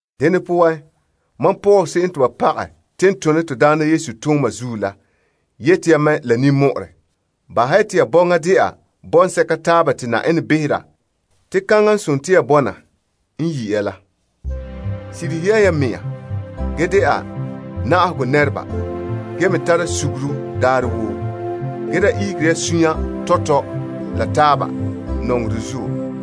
Dene poan, mam Paul se'em te ba pagɛ te n tona Na'ayenɛ tooma zuo la yete ya mɛ la ninmɔ'ɔrɛ. Bahɛ ya te ya bɔŋa dɛna bɔŋsɛka n makɛ la Yenɛ n yi' ya se'em la. Sirihe ya ya mɛŋa ge dɛna na'ahegɔ nɛreba ge me tara suguru daarɛ woo. Ge da ihegera suunre tɔtɔ la taaba nɔŋerɛ zuo.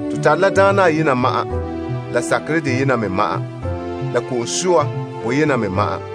To tare la Na'ayenɛ ayena ma'an la sakerɛ deyena me ma'an, la ko'om soa boyena me ma'an.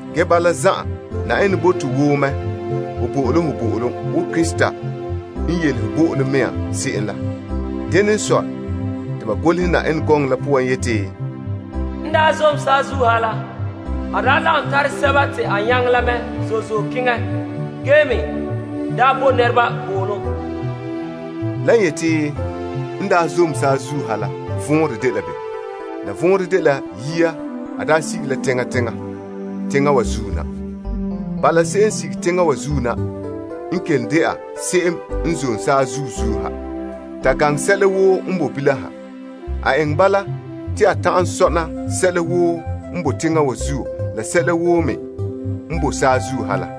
Ge bala zan'an, Yenɛ bo to woo mɛ zo'ohogɔ wo Krista n yelehe bo'olom mɛŋa se'em la. Dene n sɔe, te ba golehɛ Yenɛ gɔŋɔ la poan yeti, A zom zoore la mɛ la nyaŋere te yamehe zo'e zo'e dɔla a poore, te a bɔ'ɔra nɛreba bo'olom. Lan yeti, N daa zom saazuo saazuo ha la, vɔnrɛ dela bem? La vɔnrɛ dela yia a daa sige la teŋa teŋa, teŋa wa zuo na. Bala, se'em n sige teŋa wa zuo na, n kelom dɛna se'em n zom saazuo saazuo ha, ta gaŋɛ sɛla woo n boe bilam ha. A eŋɛ bala, te a ta'an sɔna sɛla woo n boe teŋa wa zuo la sɛla woo n me boe saazuo ha la.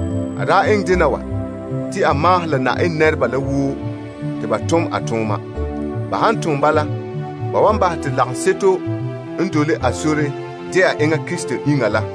A daa eŋɛ dena wa, te a maahom la Yenɛ nɛreba la woo te ba tom a tooma. Te a mɛ' lagaŋɔ la n de Yesu Krista iŋa la,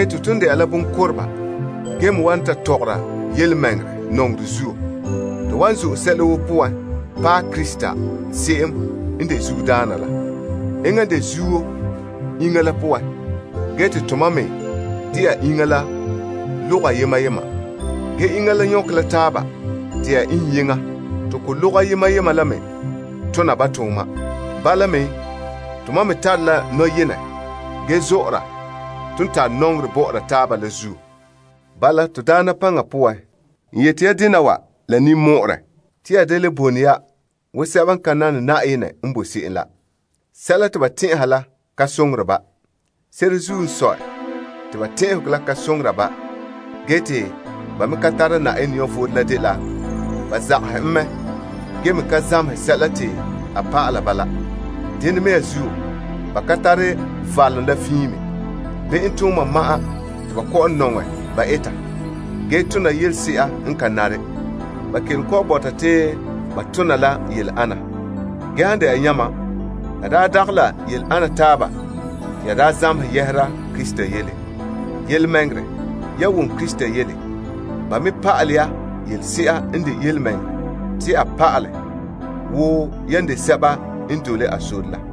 Te ton dɛna la bonkoteba ge me wan ta tɔgɔra yelemɛŋɛrɛ nɔŋerɛ zuo, to wan zo'e sɛla woo poan paɛ Krista se'em n de zuodaana la. Enŋa n de zuo iŋa la poan ge te to mam me dɛna iŋa la logoha yema yema. Ge iŋa la nyɔkɛ la taaba dɛna iŋyeŋɔ te ko logoha yema yema la me tona ba tooma. Bala me, tomam me tare la nɔyenɛ ge zɔ'ɔra ton tare nɔŋerɛ bɔ'ɔra taaba la zuo. Bala, Na'ayenɛ paŋa poan, n yeti ya dena wa la ninmɔ'ɔrɛ, te ya da le bone ya wo sɛba n ka nane Yenɛ n bo se'em la. Sɛla te ba tɛn'ɛha la ka soŋore ba. Se'ere n sɔe la, ba potɛn'ɛra boe lika poan, te ba me ka tara Yenɛ vom la ban zagahɛ en mɛ ge me ka zamehɛ sɛla te a pa'alɛ ba la zuo. Dena mea zuo, ba ka tare valom la fiin me. Be'em tooma ma'an te ba kɔ'ɔn nɔŋɛ ba eta ge tona yelese'a n ka nare. Ba kelom kɔ'ɔn bɔta te ba tona la yele ana. Ge han dɛna yamam, la daa dagɛ la yele ana taaba te ya daa zamehɛ yɛhera Krista yele. Yelemɛŋɛrɛ, ya wom Krista yele. Ba me pa'alɛ ya yelese'a n de yelemɛŋɛrɛ Yesu poan wo yan de a dɔlɔba la.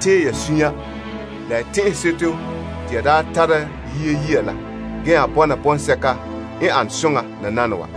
Tee ya suunre la ya tɛn'ɛseto te ya tara yia saŋa la ge nya bɔna bɔŋsɛka n ane soŋa nananawa.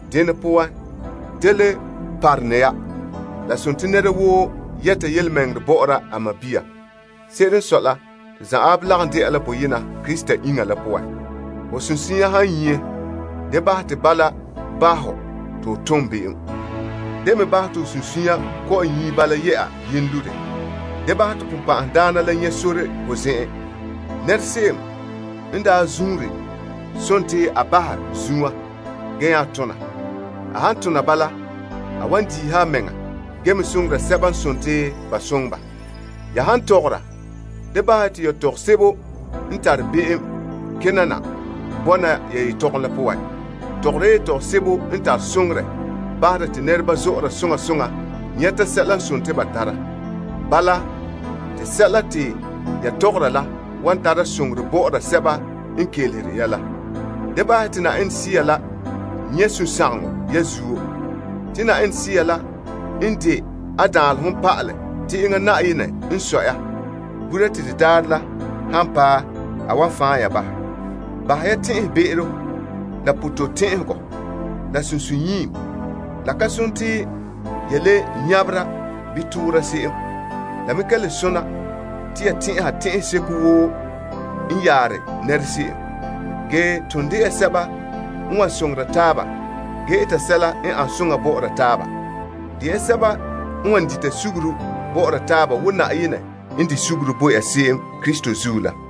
Dene poan, da le parone ya. Nɛra woo yɛta yelemɛŋɛrɛ bɔ'ɔra a sɔɔn. Se'ere n sɔe la, to zan'an lagom dɛna la boyena Krista iŋa la poan. Ho sunsunya han nyie, da bahɛ te bala bahɛ hɔ te ho tom be'em. Da me bahɛ te ho sunsunya kɔ'ɔn nyie bala yɛ'a yenlore. Da bahɛ te Sagona la nyɛ' sore ho zen'en. Se'em n daa zuunre a bahɛ zunwa ge tona. A han tona bala, a wan diiha a mɛŋa ge me soŋora sɛba n ba soŋɛ ba. Ya han tɔgɔra, da bahɛ ya te yetɔgom sebo n tare be'em kena na bɔna ya yetɔgom la poan. Tɔgɔre ya yetɔgom sebo n tare soŋorɛ bahera te nɛreba zɔ'ɔra soŋa soŋa nyɛta sɛla te ba tara. Bala, te sɛla te ya tɔgɔra la wan tara soŋorɛ bɔ'ɔra sɛba n kelehere ya la. Da nyiihe ya Yenɛ Sea la suunre. Se'ere n sɔe la, Yenɛ Sea la n de a danlehom pa'ala te enŋa Yenɛ n sɔe ya gura te de daarɛ la han paɛ a wan fan' ya bahɛ. Bahɛ ya tɛn'ɛbe'ero la pototɛn'ɛhegɔ la sunsunyiim. La ka nare te ya le nyabera bii toora se'em. La me ka le sona te ya tɛn'ɛha tɛn'ɛseko woo n yare nɛra se'em. Ge, ton de ya sɛba n wan soŋora taaba ge eta sɛla n an soŋa bɔ'ɔra taaba. De ya sɛba n wan dita suguru bɔ'ɔra taaba wo Yenɛ n di' suguru bo ya se'em Krista zuo la.